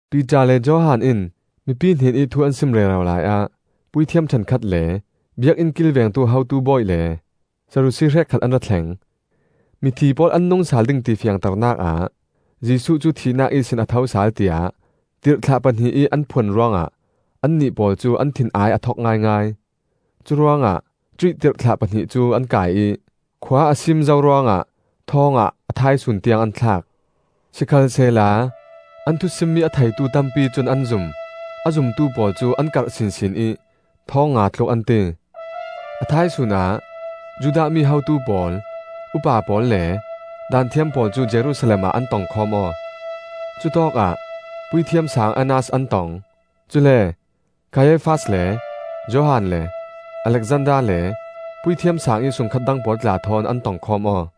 Piter le Johan in mipi hnenih thu an sim rero laiah puithiam ṭhenkhat le biakinn kilvengtu hotu bawi le Sadusi hrekkhat an ra thleng. Mithi pawl an nung sal ding ti fiangternak ah Jesuh cu thihnak ihsin a tho sal tiah tirhthlah pahnih ih an phuan ruangah annih pawl cu an thin-ai a thok ngaingai. Curuangah cuih tirhthlah pahnih cu an kai ih khua a sim zo ruangah thawngah a thaisun tiang an thlak. Sikhalsehla an thusimmi a theitu tampi cun an zum; a zumtu pawl cu an karh sinsin ih thawngnga tluk an ti. A thaisun ah Judah mi hotu pawl, upa pawl le Daanthiam pawl cu Jerusalem ah an tongkhawm aw. Cutawkah Puithiam Saang Annas an tong; cule Kaiafas le Johan le Alexander le Puithiam Saang ih sungkhat dang pawl tla thawn an tongkhawm aw.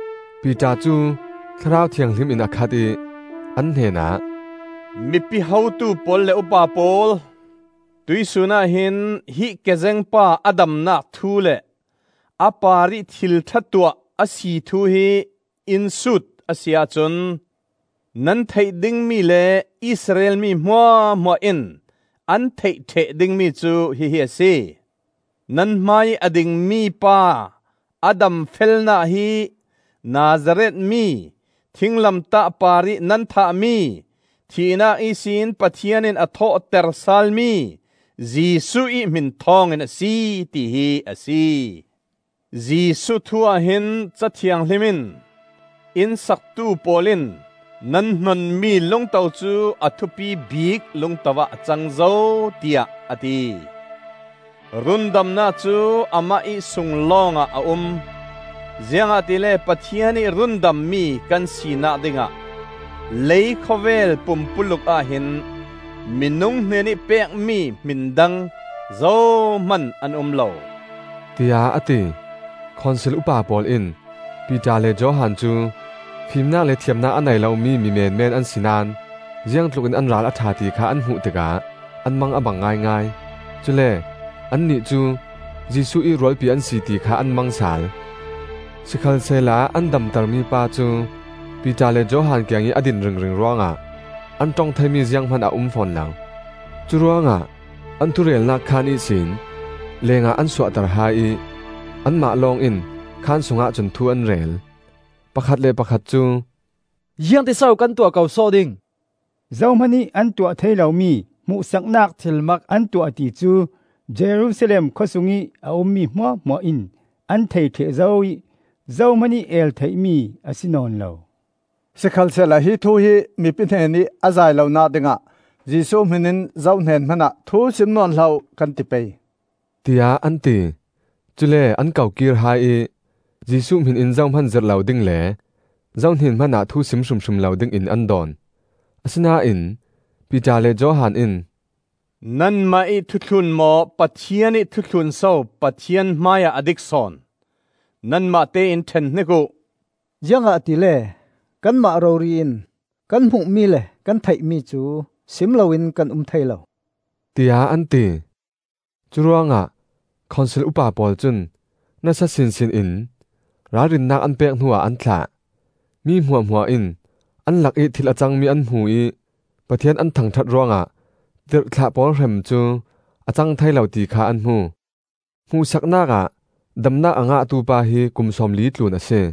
Piter cu Thlarau Thianghlim in a khat ih an hnenah, “Mipi hotu pawl le upa pawl, tuihsun ahhin hi kezeng pa a damnak thu le a parih thil ṭha tuah a si thu hi in sut a si ahcun, nan theih dingmi le Israel mi hmuahhmuah in an theih ṭheh dingmi cu hihi a si: nan hmaiih a dingmi pa a damfelnak hi Nazareth mi, thinglamtah parih nan thahmi, thihnak ihsin Pathian in a thawhter salmi Jesuh ih hmin thawngin a si, tihi a si. Jesuh thu ahhin Ca Thianghlim in: ‘Inn saktu pawl in nan hnonmi lungto cu a thupi bik lungto ah a cang zo,’ tiah a ti. Rundamnak cu amah ih sung lawngah a um; ziangahtile Pathian ih rundammi kan sinak dingah leikhawvel pumpuluk ah hin minung hnenih pekmi hmin dang zohman an um lo,” tiah a ti. Khonsil upa pawl in Piter le Johan cu fimnak le thiamnak a nei lomi mi menmen an si naón ziangtlukin an ral a ṭha ti kha an hmuh tikah an mang a bang ngaingai. Cule annih cu Jesuh ih rualpi an si ti kha an mang sal. Sikhalsehla an damtermi pa cu Piter le Johan kiangih a din ringring ruangah an ṭong theimi zianghman a um fawn lo. Curuangah an thurelnak khaan ihsin lengah an suahter hai ih anmah lawng in khaan sungah cun thu an rel. Pakhat le pakhat cu, “Ziangtin so kan tuah ko sawh ding? Zohman ih an tuah thei lomi hmuhsaknak thilmak an tuah ti cu Jerusalem khawsung ih a ummi hmuahhmuah in an thei ṭheh zo ih zohman ih el theimi a si nawn lo. Sikhalsehla hi thu hi mipi hnenih a zai lonak dingah Jesuh hmin in zohnen hmanah thu sim nawn hlah uh, kan ti pei,” tiah an ti. Cule an ko kir hai ih, Jesuh hmin in zohman zirh lo ding le zohnen hmanah thu sim hrimhrim lo dingin an dawn. Asinain Piter le Johan in, “Nanmah ih thu thlun maw Pathian ih thu thlun so Pathian hmaiah a dik sawn, nanmahte in ṭhen hnik uh. Ziangahtile kanmah rori in kan hmuhmi le kan theihmi cu sim loin kan um thei lo,” tiah an ti. Curuangah Khonsil upa pawl cun nasa sinsin in ralrinnak an pek hnuah an thlah. Mi hmuahhmuah in an lakih thil a cangmi an hmu ih Pathian an thangṭhat ruangah tirhthlah pawl hrem cu a cang thei lo ti kha an hmu. Hmuhsaknak ah damnak a ngahtu pa hi kum sawmli tlun a si.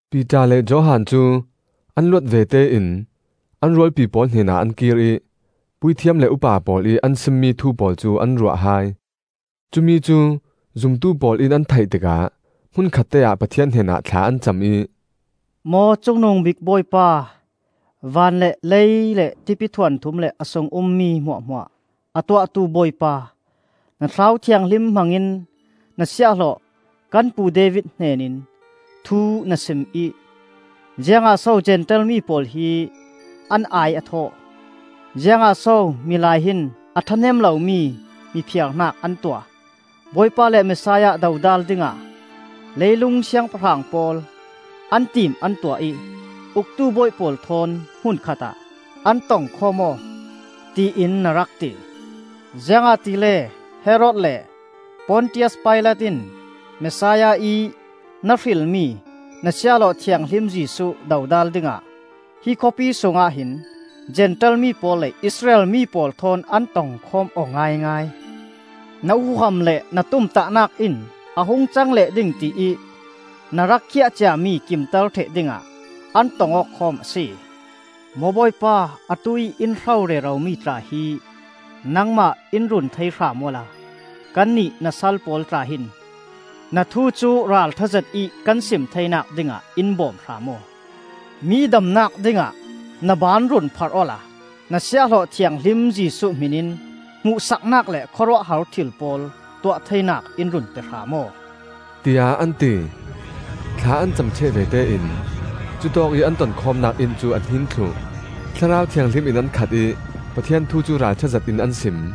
Piter le Johan cu an luat vete in an rualpi pawl hnenah an kir ih puithiam le upa pawl ih an simmi thu pawl cu an ruah hai. Cumi cu zumtu pawl in an theih tikah hmunkhatte ah Pathian hnenah thla an cam ih, “Maw Cungnungbik Bawipa, van le lei le tipithuanthum le a sungih ummi hmuahhmuah a Tuahtu Bawipa, Na Thlarau Thianghlim hmangin na siahhlawh kan pu David hnenin thu na sim ih: ‘Ziangah so Zentail mi pawl hi an ai a thawh? Ziangah so milai hin a ṭhahnem lomi mi phiarnak an tuah? Bawipa le Messiah dodal dingah, leilung siangpahrang pawl an tim an tuah ih, Uktu bawi pawl thawn hmun khatah an tongkhawm aw,’ tiin na rak ti. Ziangahtile Herod le Pontius Pilat in Messiah ih na hrilmi na Siahhlawh Thianghlim Jesuh dodal dingah hi khawpi sungah hin Zentail mi pawl le Israel mi pawl thawn an tongkhawm aw ngaingai. Na huham le na tumtahnak in a hung cang leh ding tiih na rak khiah ciami kimter ṭheh dingah an tong aw khawm a si. Maw Bawipa, atuih in hro reromi tla hi nangmah in run thei hram awla kannih na sal pawl tla hin na thu cu ralṭha zetih kan sim theinak dingah in bawm hram aw. Mi damnak dingah na baan run pharh awla na Siahhlawh Thianghlim Jesuh hmin in hmuhsaknak le khawruahhar thil pawl tuah theinak in run pe hram aw,” tiah an ti. Thla an cam ṭheh vete in cutawkih an tonkhawmnak inn cu a hnin thluh. Thlarau Thianghlim in an khat ih Pathian thu cu ralṭha zetin an sim.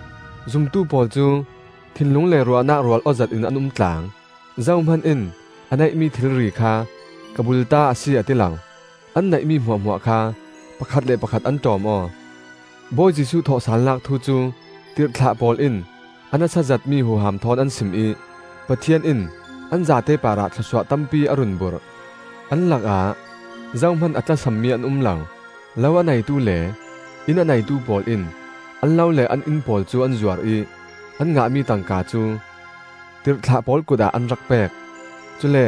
Zumtu pawl cu thinlung le ruahnak rual aw zetin an umtlang. Zohman in a neihmi thilri kha, ‘Ka bulta a si,’ a ti lo; an neihmi hmuahhmuah kha pakhat le pakhat an ṭawm aw. Bawi Jesuh thawhsalnak thu cu tirhthlah pawl in a nasa zetmi huham thawn an sim ih Pathian in an zate parah thlawsuah tampi a run burh. An lakah zohman a tlasam mi an um lo. Lo a neitu le inn a neitu pawl in an lo le an inn pawl cu an zuar ih an ngahmi tangka cu, tirhthlah pawl kutah an rak pek. Cule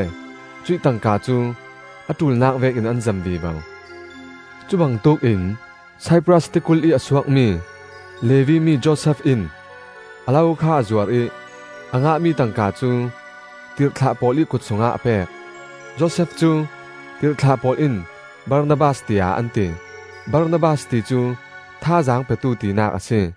cuih tangka cu a ṭulnak vekin an zem vivo. Cubangtuk in Saipras tikulh ih a suakmi Levi mi Josef in, a lo kha a zuar ih a ngahmi tangka cu tirhthlah pawl ih kut sungah a pek. Josef cu tirhthlah pawl in Barnabas tiah an ti. (Barnabas ti cu “Thazaang Petu,” tinak a si.)